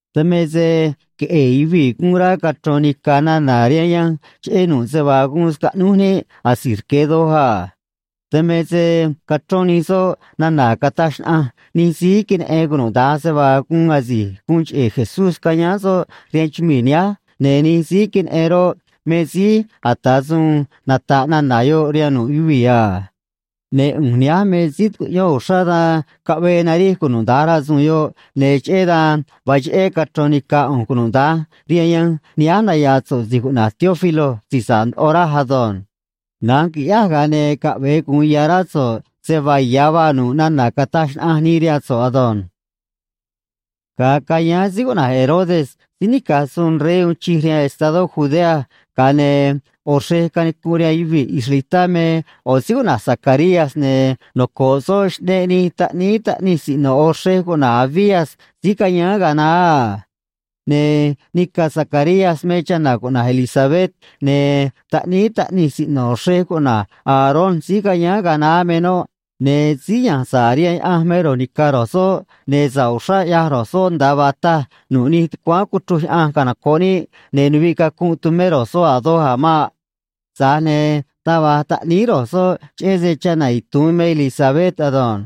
Dan me se queꞌe̱e̱ yuvii̱ guun rá cachro̱n nica̱ nana̱ rihaan yanj cheꞌé nu̱ꞌ se vaa guun scaꞌnúj níꞌ asi̱j rque̱ doj a. Dan me se cachrón nij soꞌ nana̱ cataj xnaꞌanj nij síí queneꞌen cunuda̱nj se vaa guun asi̱j guun cheꞌe̱ Jesús cayáán soꞌ rihaan chumii̱ nihánj, ne̱ nij síí queneꞌen roꞌ, me síí ata̱ suun nata̱ꞌ nana̱ yoꞌ rihaan nu̱ꞌ yuvii̱ a. Ne̱ ꞌu̱nj nihánj me síí tucuꞌyón uxrá, dan caꞌvee narij cunuda̱nj rasu̱u̱n yoꞌ, ne̱ cheꞌé dan vaa cheꞌé cachro̱n nica̱ ꞌu̱nj cunuda̱nj rihaan yanj nihánj naya̱a̱ so̱ꞌ si̱j cuꞌna̱j Teófilo si̱j sa̱ꞌ ndoꞌo, raj ado̱nj. Na̱nj qui̱ꞌyáj, ga̱a ne̱ caꞌve̱e gu̱un ya̱ rá so̱ꞌ se vaa ya̱ vaa nu̱ꞌ nana̱ cataj xnaꞌanj nii rihaan so̱ꞌ ado̱nj. Ga̱a cayáán síí cuꞌna̱j Herodes síí nica̱j suun rey uun chij rihaan estadó Judea, ga̱a ne̱ ꞌo̱ xrej canicunꞌ rihaan yuvii̱ israelitá me ꞌo̱ síí cuꞌna̱j Zacarías, ne̱ noco̱ꞌ soꞌ xꞌneꞌ nij taꞌníí taꞌnij siꞌno̱ ꞌo̱ xrej cuꞌna̱j Abías síí cayáán ga̱a naá a. Ne̱ nica̱ Zacarías me chana̱ cuꞌna̱j Elisabet, ne̱ taꞌníí taꞌnij siꞌno̱ xrej cuꞌna̱j Aarón síí cayáán ga̱a naá me noꞌ, ne̱ síí ya̱nj sa̱ꞌ rihaan Yaꞌanj me ro̱j ni̱ca̱ ro̱j soꞌ, ne̱ sa̱ꞌ uxrá ꞌyaj ro̱j soꞌ nda̱a vaa taj nu̱ꞌ nij tucuáán cuchruj Yaꞌanj canoco̱ꞌ níꞌ, ne̱ nuviꞌ cacunꞌ tumé ro̱j soꞌ a̱ doj a̱ maꞌ. Tza̱j ne̱ taj va̱j taꞌníí ro̱j soꞌ, cheꞌé se chana̱ itu̱un me Elisabet ado̱nj.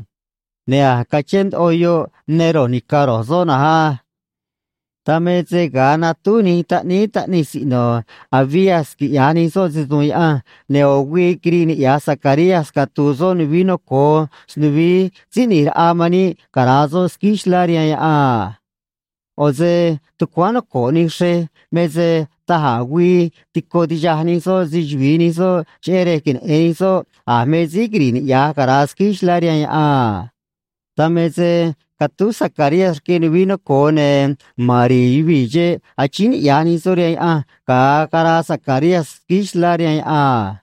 Ne̱ a̱j cachén ndoꞌo yoꞌ ne ro̱j ni̱ca̱ ro̱j soꞌ na̱nj á. Dan me se ga̱a natúj nij taꞌníí taꞌnij siꞌno̱ Abías quiꞌya̱j nij soꞌ se‑su̱u̱n Yaꞌanj, ne̱ ꞌo̱ güii quiriꞌ niꞌya̱j Zacarías catu̱u̱ soꞌ nuvií noco̱o snuvií Síí ꞌNi̱j Raꞌa man níꞌ cara̱a soꞌ squíí xlá rihaan yaꞌan a. ꞌO̱ se tucuáán noco̱ꞌ nij xrej me se da̱j a̱ güii tico tixaj nij soꞌ se‑chuvi̱i nij soꞌ, cheꞌé rej queneꞌe̱n nij soꞌ a̱ me síí quiri̱ꞌ niꞌya̱j cara̱a squíí xlá rihaan yaꞌan a. Dan me se catúj Zacarías rque nuvií noco̱o, ne̱ ma̱n ri̱i̱ yuvii̱ xeꞌ, achíín niꞌya̱j nij soꞌ rihaan Yaꞌanj ga̱a caraa Zacarías squíí xlá rihaan yaꞌan a.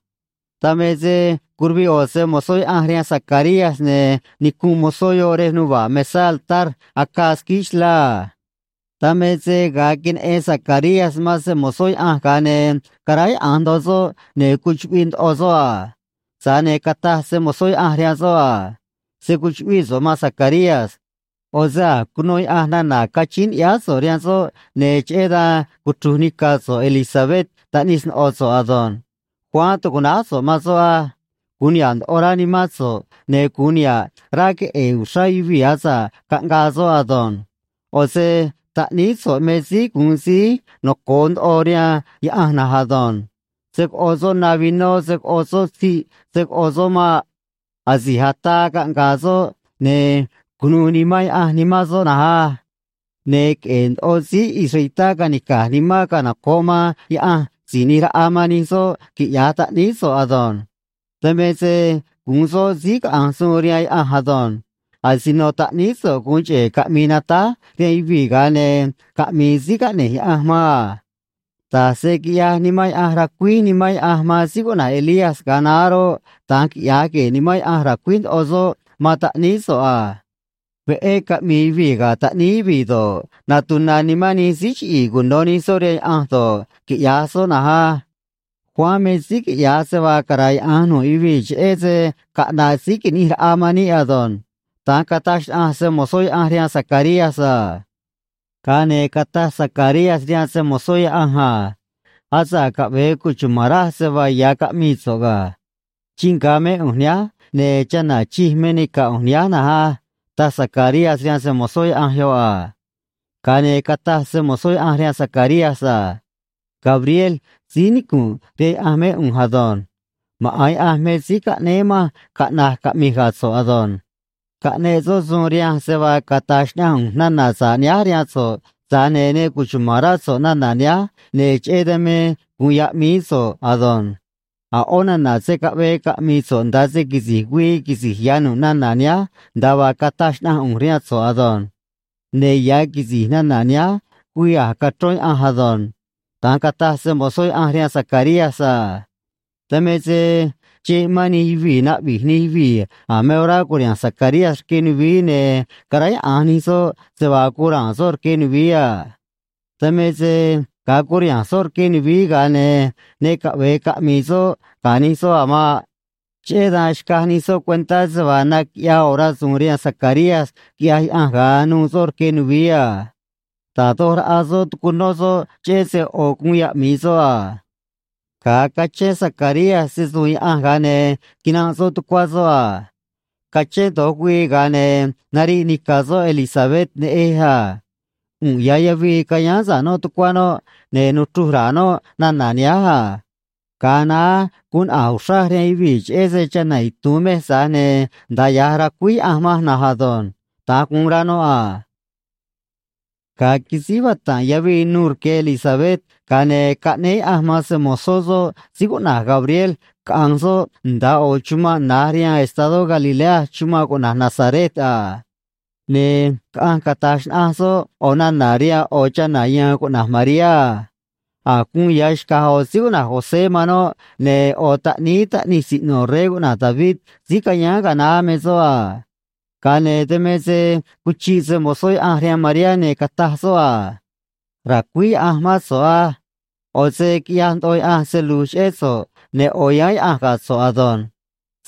Dan me se curuviꞌ ꞌo̱ se‑mo̱zó Yaꞌanj rihaan Zacarías, ne̱ nicunꞌ mozó yoꞌ rej nuva̱ꞌ mesá altar acaa squíí xlá a. Dan me se ga̱a queneꞌen Zacarías man se‑mo̱zó Yaꞌanj, ga̱a ne̱ caráyaꞌa̱nj ndoꞌo soꞌ ne̱ cuchuꞌviꞌ ndoꞌo soꞌ a. Tza̱j ne̱ cataj se‑mo̱zó Yaꞌanj rihaan soꞌ a: ―Se̱ cuchuꞌvíꞌ so̱ꞌ, maan Zacarías. ꞌO̱ se a̱j cuno Yaꞌanj nana̱ cachíín ni̱ꞌyáá so̱ꞌ rihaan soꞌ, ne̱ cheꞌé dan cuchru̱j nica̱ so̱ꞌ Elisabet taꞌnij sno̱ꞌo so̱ꞌ ado̱nj. Juan tu̱cuꞌnáj so̱ꞌ man soꞌ á. Gu̱un niha̱ꞌ ndoꞌo rá nimán so̱ꞌ, ne̱ gu̱un niha̱ꞌ rá queꞌe̱e̱ uxrá yuvii̱ asa̱ꞌ caꞌngaa soꞌ ado̱nj. ꞌO̱ se taꞌníí so̱ꞌ me síí gu̱un síí noco̱o ndoꞌo rihaan Yaꞌanj na̱nj ado̱nj. Se̱ coꞌo soꞌ na vinó se̱ coꞌo soꞌ tziꞌ se̱ coꞌo soꞌ maꞌ. Asi̱j ataa caꞌnga̱a̱ soꞌ, ne̱ cu̱nuû Nimán Yaꞌanj nimán soꞌ na̱nj á. Ne̱ queꞌe̱e̱ ndoꞌo síí israelitá ca̱nica̱j nimán canoco̱ꞌ man Yaꞌanj Si̱j ꞌNi̱j Raꞌa man nij soꞌ, quiꞌya̱j taꞌníí so̱ꞌ ado̱nj. Dan me se gu̱un soꞌ síí caꞌa̱nj suun rihaan Yaꞌanj ado̱nj. Asino taꞌníí so̱ꞌ gu̱un cheꞌe̱ caꞌmi̱i̱ natáj rihaan yuvii̱, ga̱a ne̱ caꞌmi̱i̱ síí caꞌne̱j Yaꞌanj man a. Da̱j se quiꞌyaj Nimán Yaꞌanj, racuíj Nimán Yaꞌanj man síí cuꞌna̱j Elías ga̱a naá roꞌ, da̱nj quiꞌya̱j gue̱e̱ Nimán Yaꞌanj, ra̱cuíj ndoꞌo soꞌ man taꞌníí so̱ꞌ a. Veꞌé caꞌmi̱i̱ yuvii̱ ga̱ taꞌníí yuvii̱ do̱ꞌ, natuna̱ nimán nij síí chiꞌi̱i̱ cuno̱ nij soꞌ rihaan Yaꞌanj do̱ꞌ, quiꞌya̱j soꞌ na̱nj á. Juan me síí quiꞌya̱j se vaa cara̱yaꞌa̱nj nu̱ꞌ yuvii̱ cheꞌé se caꞌna̱ꞌ Síí Qui̱ꞌnij Raꞌa man níꞌ ado̱nj ―da̱nj cataj xnaꞌanj se‑mo̱zó Yaꞌanj rihaan Zacarías a. Ga̱a ne̱ cataj Zacarías rihaan se‑mo̱zó Yaꞌanj a: ―Asa̱ꞌ caꞌve̱e cuchuma̱n raj se vaa ya̱ caꞌmii so̱ꞌ ga̱. Chii nga̱ mé ꞌu̱nj nihánj, ne̱ chana̱ chij me nica̱ ꞌu̱nj nihánj na̱nj á ―taj Zacarías rihaan se‑mo̱zó Yaꞌanj yoꞌ a. Ga̱a ne̱ cataj se‑mo̱zó Yaꞌanj rihaan Zacarías a: ―Gabriel síí nicu̱nꞌ rihaan Yaꞌanj mé ꞌu̱nj ado̱nj. Maꞌa̱n Yaꞌanj me síí caꞌnéé manj caꞌna̱j caꞌmi̱j ga̱ so̱ꞌ ado̱nj. Caꞌneꞌ soꞌ suun rihanj se vaa cata̱j xnaꞌanj ꞌu̱nj nana̱ sa̱ꞌ nihánj rihaan so̱ꞌ, tza̱j ne̱ ne cuchuma̱n rá so̱ꞌ nana̱ nihánj, ne̱ cheꞌé dan me gu̱un ya̱ꞌmií so̱ꞌ ado̱nj. A̱ ꞌó nana̱ se̱ caꞌvee caꞌmi̱i̱ so̱ꞌ nda̱a se quisi̱j güii quisi̱j ya̱ nu̱ꞌ nana̱ nihánj nda̱a vaa cataj xnaꞌanj ꞌu̱nj rihaan so̱ꞌ ado̱nj. Ne̱ ya̱ quisi̱j nana̱ nihánj güii a̱j cachrón Yaꞌanj ado̱nj ―da̱nj cataj se‑mo̱zó Yaꞌanj rihaan Zacarías a. Dan me se xeꞌ mán nij yuvii̱, naꞌvi̱j nij yuvii̱ a̱ me orá cu̱riha̱nj Zacarías rque nuvií, ne̱ caráyaꞌa̱nj nij soꞌ se vaa guun ra̱a̱n soꞌ rque nuvií a. Dan me se ga̱a curiha̱nj soꞌ rque nuvií, ga̱a ne̱ ne caꞌve̱e caꞌmi̱i̱ soꞌ ga̱ nij soꞌ a̱ maꞌ. Cheꞌé dan xcaj nij soꞌ cuentá se vaa naquiꞌyaa ꞌo̱ rasu̱u̱n rihaan Zacarías, quiꞌyaj Yaꞌanj, ga̱a nu̱u̱ soꞌ rque nuvií a. Da̱j doj raꞌa soꞌ tucunó soꞌ cheꞌé se ꞌo̱ guun yaꞌmi̱i soꞌ a. Ga̱a cachén Zacarías se‑su̱u̱n Yaꞌanj, ga̱a ne̱ quinanꞌ soꞌ tucuá soꞌ a. Cachén do̱j güii, ga̱a ne̱ nariꞌ nica̱ soꞌ Elisabet neꞌej a. ꞌU̱nꞌ ya̱ yavii cayáán sa̱ꞌ noꞌ tucuá noꞌ, ne̱ nuchruj ra̱a̱ noꞌ nana̱ nihánj a: “Ga̱a naá guun naꞌa̱j uxraj rihaan yuvii̱ cheꞌé se chana̱ itu̱un mej, tza̱j ne̱ nda̱a ya̱j racuíj Yaꞌanj manj na̱nj ado̱nj.” Da̱nj guun rá noꞌ a. Ga̱a quisíj vata̱nꞌ yavii nu̱u̱ rque Elisabet, ga̱a ne̱ caꞌnéé Yaꞌanj man se‑mo̱zó soꞌ síí cuꞌna̱j Gabriel caꞌa̱nj soꞌ nda̱a ꞌo̱ chumanꞌ na̱j rihaan estadó Galilea chumanꞌ cuꞌna̱j Nazaret a. Ne̱ caꞌanj cata̱j xnaꞌanj soꞌ ꞌo̱ nana̱ rihaan ꞌo̱ chana̱ ya̱a̱n cuꞌna̱j Mariá a. A̱j guun ya̱ xca̱j ꞌo̱ síí cuꞌna̱j José man noꞌ, ne̱ ꞌo̱ taꞌníí taꞌnij siꞌno̱ rey cuꞌna̱j David síí cayáán ga̱a naá me soꞌ a. Ga̱a ne̱ dan me se cuchiꞌ se‑mo̱zó Yaꞌanj rihaan Mariá, ne̱ cataj soꞌ a: ―Ra̱cuíj Yaꞌanj mán so̱ꞌ á. ꞌO̱ se quiꞌyaj ndoꞌo Yaꞌanj se lu̱j cheꞌé so̱ꞌ, ne̱ ꞌo̱ yáán Yaꞌanj ga̱ so̱ꞌ ado̱nj.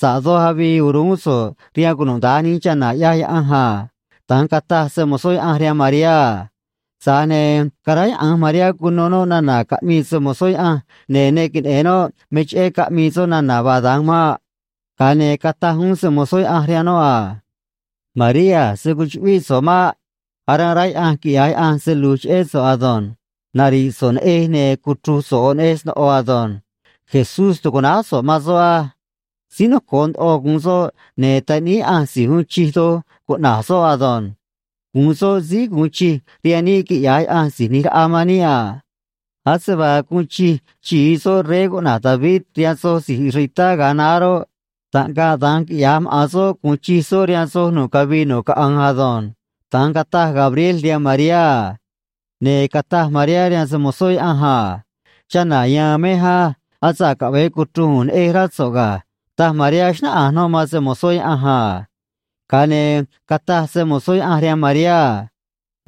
Sa̱ꞌ doj avii uruún so̱ꞌ rihaan cunuda̱nj nij chana̱, ꞌyaj Yaꞌanj a ―da̱nj cataj se‑mo̱zó Yaꞌanj rihaan Mariá a. Tza̱j ne̱ caráyaꞌa̱nj Mariá cuno noꞌ nana̱ caꞌmii se‑mo̱zó Yaꞌanj, ne̱ ne queneꞌe̱n noꞌ me cheꞌé caꞌmii soꞌ nana̱ vaa da̱nj maꞌ. Ga̱a ne̱ cataj uún se‑mo̱zó Yaꞌanj rihaan noꞌ a: ―María, se̱ cuchuꞌvíꞌ so̱ꞌ maꞌ. Aranꞌ rá Yaꞌanj quiꞌya̱j Yaꞌanj se lu̱j cheꞌé so̱ꞌ ado̱nj. Nari̱ꞌ so̱ꞌ neꞌej, ne̱ cuchru̱j so̱ꞌ ꞌo̱ neꞌej sno̱ꞌo ado̱nj. JESÚS tu̱cuꞌnáj so̱ꞌ man soꞌ á. Síí noco̱o ndoꞌo gu̱un soꞌ, ne̱ Taꞌníí Yaꞌanj Si̱j Uun Chij Doj cuꞌna̱j soꞌ ado̱nj. Gu̱un soꞌ síí gu̱un chij rihaan níꞌ, quiꞌya̱j Yaꞌanj Si̱j ꞌNi̱j Raꞌa man níꞌ a. Ase vaa guun chij xi̱i soꞌ rey cuꞌna̱j David rihaan soj si̱j israelitá ga̱a naá roꞌ, taꞌngaꞌ da̱nj quiꞌya̱j maꞌa̱n soꞌ gu̱un chij soꞌ rihaan soj nu̱ꞌ cavii nu̱ꞌ caꞌanj ado̱nj ―da̱nj cataj Gabriel rihaan Mariá a. Ne̱ cataj Mariá rihaan se‑mo̱zó Yaꞌanj a: ―Chana̱ ya̱a̱n mej á. Asa̱ꞌ caꞌve̱e cuchru̱j ꞌu̱nj neꞌej, rá so̱ꞌ ga̱ ―taj Mariá, xnáꞌanj noꞌ man se‑mo̱zó Yaꞌanj a. Ga̱a ne̱ cataj se‑mo̱zó Yaꞌanj rihaan Mariá a: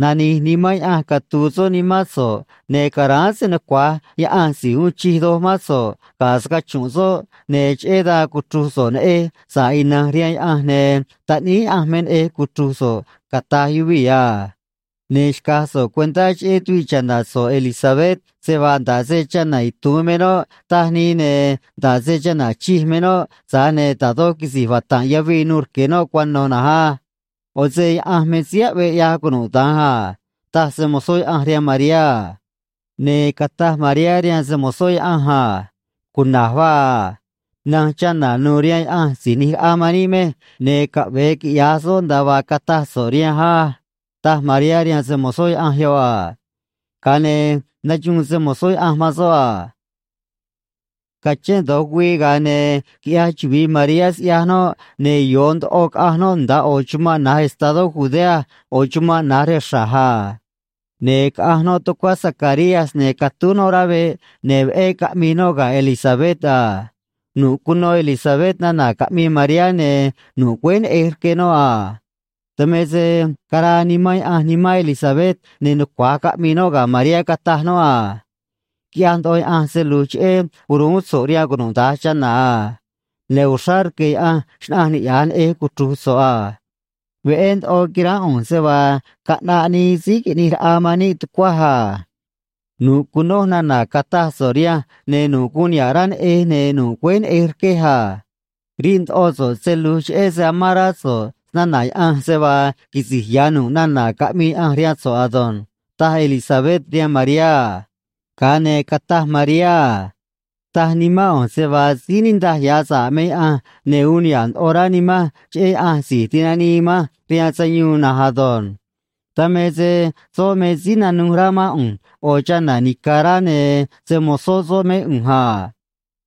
―Nani̱j Nimán Yaꞌanj catu̱u̱ soꞌ nimán so̱ꞌ, ne̱ ca̱ráán se‑nucua̱j Yaꞌanj Si̱j Uun Chij Doj mán so̱ꞌ ga̱ scachu̱nꞌ soꞌ, ne̱ cheꞌé dan cuchru̱j so̱ꞌ neꞌej sa̱ꞌ ina̱nj rihaan Yaꞌanj, ne̱ Taꞌníí Yaꞌanj me neꞌej cuchru̱j so̱ꞌ, cata̱j yuvii̱ a. Ne̱ xca̱j so̱ꞌ cuentá cheꞌé tuviꞌ cha̱na̱ so̱ꞌ Elisabet se vaa nda̱ꞌ se chana̱ itu̱un me noꞌ, taj nii, ne̱ nda̱ꞌ se chana̱ chij me noꞌ, tza̱j ne̱ da̱j doj quisi̱j vata̱nꞌ yavii nuû rque noꞌ cuano̱ na̱nj á. ꞌO̱ se Yaꞌanj me síí aꞌvee ꞌyaj cunuda̱nj a ―taj se‑mo̱zó Yaꞌanj rihaan Mariá a. Ne̱ cataj Mariá rihaan se‑mo̱zó Yaꞌanj a: ―Cuna̱j vaa a. Na̱nj chana̱ nu̱u̱ rihaan Yaꞌanj Si̱j ꞌNi̱j Raꞌa man níꞌ mej, ne̱ caꞌve̱e quiꞌya̱j soꞌ nda̱a vaa cataj so̱ꞌ rihanj á ―taj Mariá rihaan se‑mo̱zó Yaꞌanj yoꞌ a. Ga̱a ne̱ naxuun se‑mo̱zó Yaꞌanj man soꞌ a. Cachén do̱j güii, ga̱a ne̱ quiꞌyaj chuvi̱i Mariá siꞌyaj noꞌ, ne̱ yo̱o ndoꞌo caꞌanj noꞌ nda̱a ꞌo̱ chumanꞌ na̱j estadó Judea, ꞌo̱ chumanꞌ na̱j rej xra̱j a. Ne̱ caꞌanj noꞌ tucuá Zacarías, ne̱ catúj noꞌ rá veꞌ, ne̱ veꞌé caꞌmii noꞌ ga̱ Elisabet a. Nu̱ꞌ cuno Elisabet nana̱ caꞌmii Mariá, ne̱ nu̱ꞌ güéj neꞌej rque noꞌ a. Dan me se caraa Nimán Yaꞌanj nimán Elisabet, ne̱ nucua̱j caꞌmii noꞌ ga̱ Mariá, cataj noꞌ a: ―Quiꞌyaj ndoꞌo Yaꞌanj se lu̱j cheꞌé uruún so̱ꞌ rihaan cunuda̱nj chana̱ a. Ne̱ uxrá rque̱ Yaꞌanj xnaꞌanj niꞌya̱j neꞌej cuchru̱j so̱ꞌ a. Veꞌé ndoꞌo quiránꞌ ꞌu̱nj se vaa caꞌnaꞌ nii Síí Qui̱ꞌnij Raꞌa man níꞌ tucuaj a. Nu̱ꞌ cunoj nana̱ cataj so̱ꞌ rihanj, ne̱ nu̱ꞌ guun niha̱ꞌ rá neꞌej, ne̱ nu̱ꞌ güéj neꞌej rquej a. Riꞌ ndoꞌo so̱ꞌ se lu̱j cheꞌé se amán rá so̱ꞌ snana̱ Yaꞌanj, se vaa quisi̱j ya̱ nu̱ꞌ nana̱ caꞌmii Yaꞌanj rihaan so̱ꞌ ado̱nj ―taj Elisabet rihaan Mariá a. Ga̱a ne̱ cataj Mariá a: Taj nimán ꞌu̱nj se vaa síí niꞌndaj ya̱ sa̱ꞌ me Yaꞌanj, ne̱ uun niha̱ꞌ ndoꞌo rá nimanj cheꞌé Yaꞌanj Si̱j Tinanii manj rihaan Sayuun na̱nj ado̱nj. Dan me se soꞌ me síí nanuj rá mán ꞌu̱nj, ꞌo̱ chana̱ nica̱ꞌ rá, ne̱ se‑mo̱zó soꞌ mé ꞌu̱nj a.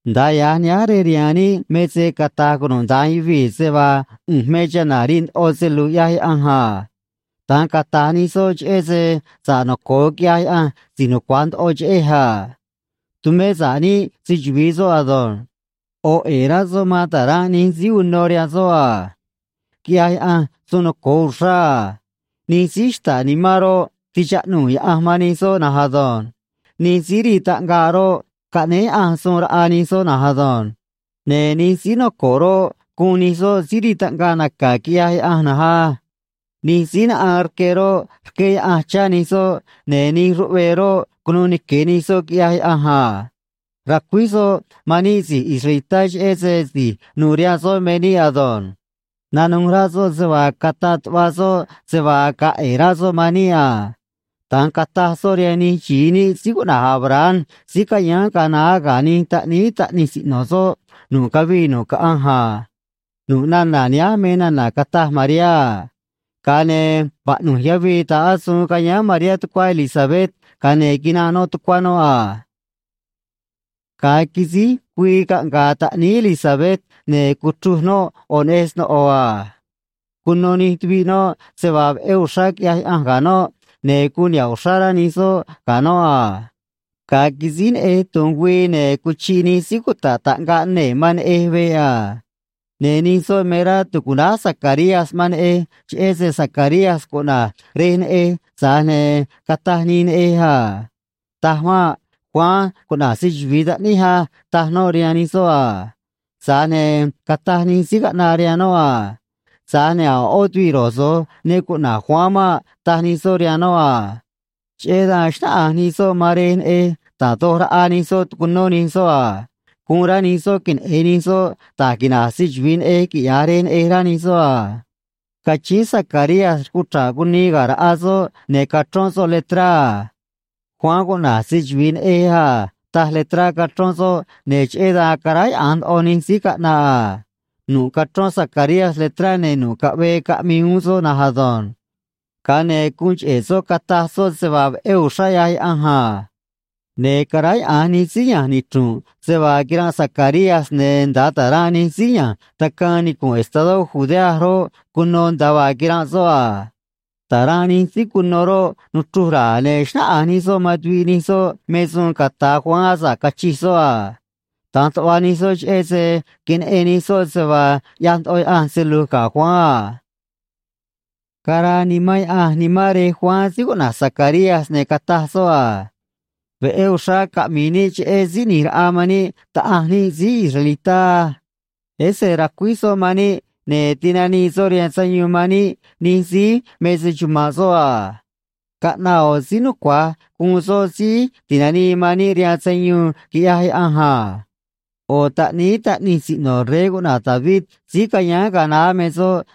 Nda̱a ya̱j nihánj rej rihaan níꞌ me se cata̱j cunuda̱nj yuvii̱ se vaa ꞌu̱nj me chana̱ riꞌ ndoꞌo se lu̱j ꞌyaj Yaꞌanj a. Da̱nj cata̱j nij soꞌ cheꞌé se sa̱ꞌ noco̱o quiꞌyaj Yaꞌanj Si̱j Nucua̱j Ndoꞌo cheꞌej a. Tumé sa̱ꞌ níꞌ se‑chuvi̱i soꞌ ado̱nj. ꞌO̱ ꞌe̱e̱ rá soꞌ man ta̱ranꞌ nij síí uno rihaan soꞌ a. Quiꞌyaj Yaꞌanj suun noco̱o uxrá a. Nij síí xta̱ꞌ nimán roꞌ, tichaꞌnuu̱ Yaꞌanj man nij soꞌ na̱nj ado̱nj. Nij síí rii taꞌngaꞌ roꞌ, caꞌnéj Yaꞌanj suun raꞌa nij soꞌ na̱nj ado̱nj. Ne̱ nij síí noco̱ꞌ roꞌ, guun nij soꞌ síí rii taꞌngaꞌ naca̱, quiꞌyaj Yaꞌanj na̱nj á. Nij síí naꞌaan rque roꞌ, rqué Yaꞌanj chá nij soꞌ, ne̱ nij ruꞌvee roꞌ, cunuu nique̱ nij soꞌ, quiꞌyaj Yaꞌanj a. Racuíj soꞌ man níꞌ si̱j israelitá, cheꞌé se si̱j nu̱u̱ rihaan soꞌ me níꞌ ado̱nj. Nanuj rá soꞌ se vaa cataꞌ tuꞌva soꞌ se vaa ga̱a̱ ꞌe̱e̱ rá soꞌ man níꞌ a. Da̱nj cataj soꞌ rihaan nij xi̱i níꞌ síí cuꞌna̱j Abraham síí cayáán ga̱a naá ga̱ nij taꞌníí taꞌnij siꞌno̱ soꞌ nu̱ꞌ cavii nu̱ꞌ caꞌanj a. Nu̱ꞌ nana̱ nihánj me nana̱ cataj Mariá a. Ga̱a ne̱ vaꞌnu̱j yavii ta̱ꞌ asuun cayáán Mariá tucuá Elisabet, ga̱a ne̱ quinanꞌ noꞌ tucuá noꞌ a. Ga̱a quisíj güii caꞌnga̱a̱ taꞌníí Elisabet, ne̱ cuchruj noꞌ ꞌo̱ neꞌej sno̱ꞌo a. Cuno nij tuviꞌ noꞌ se vaa veꞌé uxrá quiꞌyaj Yaꞌanj ga̱ noꞌ, ne̱ guun niha̱ꞌ uxrá rá nij soꞌ ga̱ noꞌ a. Ga̱a quisíj neꞌej tu̱nj güii, ne̱ cuchiꞌ nij síí cuta̱ꞌ taꞌngaꞌ nee̱ man neꞌej veꞌ a. Ne̱ nij soꞌ me rá tu̱cuꞌnáj Zacarías man neꞌej cheꞌé se Zacarías cuꞌna̱j rej neꞌej, tza̱j ne̱ cataj nii neꞌej a: ―Taj maꞌ. Juan cuꞌna̱j se‑chuvi̱i taꞌníj á ―taj noꞌ rihaan nij soꞌ a. Tza̱j ne̱ cataj nij síí caꞌnaꞌ rihaan noꞌ a: ―Tza̱j ne̱ a̱ ꞌó tuviꞌ ro̱j so̱j ne cuꞌna̱j Juan maꞌ ―taj nij soꞌ rihaan noꞌ a. Cheꞌé dan xnáꞌanj nij soꞌ man rej neꞌej, da̱j doj raꞌa nij soꞌ tucunó nij soꞌ a. Guun rá nij soꞌ queneꞌe̱n nij soꞌ da̱j quina̱j se‑chuvi̱i neꞌej, quiꞌya̱j rej neꞌej, rá nij soꞌ a. Cachíín Zacarías rucuchra̱ꞌ cunii ga̱ raꞌa soꞌ, ne̱ cachrón soꞌ letrá a: “Juan cuꞌna̱j se‑chuvi̱i neꞌej a”, taj letrá cachrón soꞌ, ne̱ cheꞌé dan caráyaꞌa̱nj ndoꞌo nij síí caꞌnaꞌ a. Nu̱ꞌ cachrón Zacarías letrá, ne̱ nu̱ꞌ caꞌvee caꞌmii uún soꞌ na̱nj ado̱nj. Ga̱a ne̱ guun cheꞌe̱ soꞌ cataj soꞌ se vaa veꞌé uxrá ꞌyaj Yaꞌanj a. Ne̱ caráyaꞌa̱nj nij síí ya̱nj nichru̱nꞌ se vaa quiranꞌ Zacarías, ne̱ nda̱a ta̱ranꞌ nij síí ya̱nj tacaan nicu̱nꞌ estadó Judea roꞌ, cuno nda̱a vaa quiranꞌ soꞌ a. Ta̱ranꞌ nij síí cuno roꞌ, nuchruj ra̱a̱, ne̱ xnáꞌanj nij soꞌ man tuviꞌ nij soꞌ me suun ca̱ta̱ Juan asa̱ꞌ cachij soꞌ a. Da̱nj tuꞌva nij soꞌ cheꞌé se queneꞌen nij soꞌ se vaa ꞌyaj ndoꞌo Yaꞌanj se lu̱j ga̱ Juan a. Caraa Nimán Yaꞌanj nimán rej Juan síí cuꞌna̱j Zacarías, ne̱ cataj soꞌ a: Veꞌé uxrá caꞌmi̱i̱ níꞌ cheꞌé Síí ꞌNi̱j Raꞌa man níꞌ, Taꞌanj níꞌ síí israelitá á. Ese racuíj soꞌ man níꞌ, ne̱ tinanii soꞌ rihaan sayuun man níꞌ nij síí me se‑chuma̱nꞌ soꞌ a. Caꞌnaꞌ ꞌo̱ síí nucua̱j gu̱un soꞌ Síí Ti̱nanii man níꞌ rihaan sayuun, quiꞌyaj Yaꞌanj a. ꞌO̱ taꞌníí taꞌnij siꞌno̱ rey cuꞌna̱j David síí cayáán ga̱a naá me soꞌ,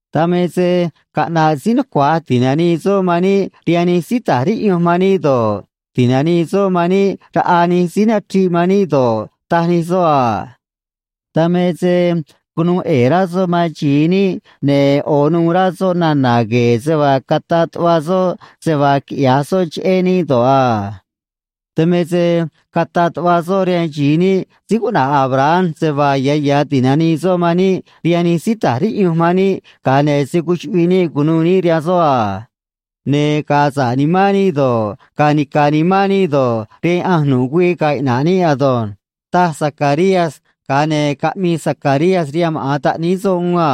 Dan me se caꞌna̱ꞌ síí nucua̱j ti̱nanii soꞌ man níꞌ rihaan nij síí ta̱j riꞌyunj man níꞌ do̱ꞌ, ti̱nanii soꞌ man níꞌ raꞌa nij síí nachriꞌ man níꞌ do̱ꞌ, taj nij soꞌ a. Dan me se cunuu ꞌe̱e̱ rá soꞌ man xi̱i níꞌ, ne̱ ꞌo̱ nuû rá soꞌ nana̱ gue̱e̱ se vaa cataꞌ tuꞌva soꞌ se vaa quiꞌya̱j soꞌ cheꞌé níꞌ do̱ꞌ a. Dan me se cataꞌ tuꞌva soꞌ rihaan xi̱i níꞌ síí cuꞌna̱j Abraham se vaa ya̱ ya̱ ti̱nanii soꞌ man níꞌ rihaan nij síí ta̱j riꞌyunj man níꞌ, ga̱a ne̱ se̱ cuchuꞌviꞌ níꞌ cu̱nuû níꞌ rihaan soꞌ a. Ne̱ ga̱a̱ sa̱ꞌ nimán níꞌ do̱ꞌ, ga̱a̱ nica̱ nimán níꞌ do̱ꞌ, rihaan Yaꞌanj nu̱ꞌ güii ga̱a̱ iꞌna̱ꞌ níꞌ ado̱nj, taj Zacarías, ga̱a ne̱ caꞌmii Zacarías rihaan maꞌa̱n taꞌníí soꞌ uún a: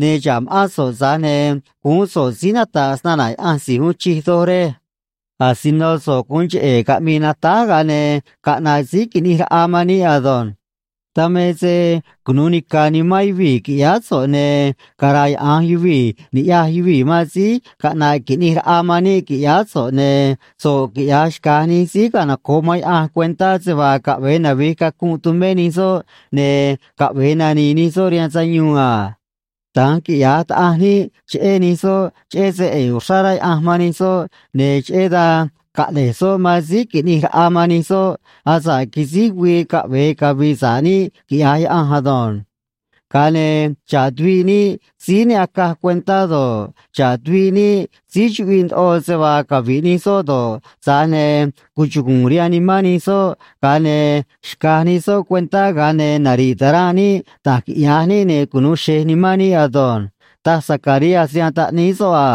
Ne̱ xa̱ꞌ ma̱ꞌán so̱ꞌ, tza̱j ne̱ guún so̱ꞌ síí nata̱ꞌ snana̱ Yaꞌanj Si̱j Uun Chij Doj, rej. Asino so̱ꞌ gu̱un cheꞌe̱ caꞌmi̱i̱ natáj, ga̱a ne̱ caꞌna̱ꞌ Síí Qui̱ꞌnij Raꞌa man níꞌ ado̱nj. Dan me se cunu̱u nica̱ nimán yuvii̱, qui̱ꞌyáá so̱ꞌ, ne̱ cara̱yaꞌa̱nj yuvii̱ ni̱ꞌyaj yuvii̱ man síí caꞌna̱ꞌ qui̱ꞌnij raꞌa man níꞌ, qui̱ꞌyáá so̱ꞌ, ne̱ so̱ꞌ quiꞌya̱j xca̱j nij síí canoco̱ꞌ man Yaꞌanj cuentá se vaa caꞌve̱e navi̱j cacunꞌ tumé nij soꞌ, ne̱ caꞌve̱e nani̱i̱ nij soꞌ rihaan sayuun a. Da̱nj quiꞌya̱j Taꞌanj níꞌ cheꞌé nij soꞌ cheꞌé se ꞌe̱e̱ uxrá rá Yaꞌanj man nij soꞌ, ne̱ cheꞌé dan caꞌne̱j soꞌ man Síí Qui̱ꞌnij Raꞌa man nij soꞌ asa̱ꞌ quisíj güii caꞌve̱e cavi̱i̱ sa̱ꞌ níꞌ quiꞌya̱j Yaꞌanj ado̱nj. Ga̱a ne̱ xa̱ꞌ tuviꞌ níꞌ síí ne acaj cuentá do̱ꞌ, xa̱ꞌ tuviꞌ níꞌ síí chuꞌviꞌ ndoꞌo se vaa cavi̱ꞌ nij soꞌ do̱ꞌ, tza̱j ne̱ cuchugu̱u̱n rihaan nimán nij soꞌ, ga̱a ne̱ xca̱j nij soꞌ cuentá, ga̱a ne̱ nari̱ꞌ ta̱ranꞌ níꞌ da̱j quiꞌya̱j níꞌ, ne̱ cunu̱u xe̱j nimán níꞌ ado̱nj, taj Zacarías rihaan taꞌníí soꞌ a.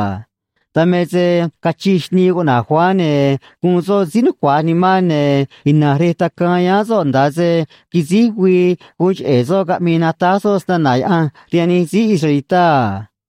Dan me se cachij xnii cuꞌna̱j Juan, ne̱ guun soꞌ síí nucua̱j nimán, ne̱ ina̱nj rej tacaan yáán soꞌ nda̱a se quisíj güii guun cheꞌe̱ soꞌ caꞌmii natáj soꞌ snana̱ Yaꞌanj rihaan nij síí israelitá a.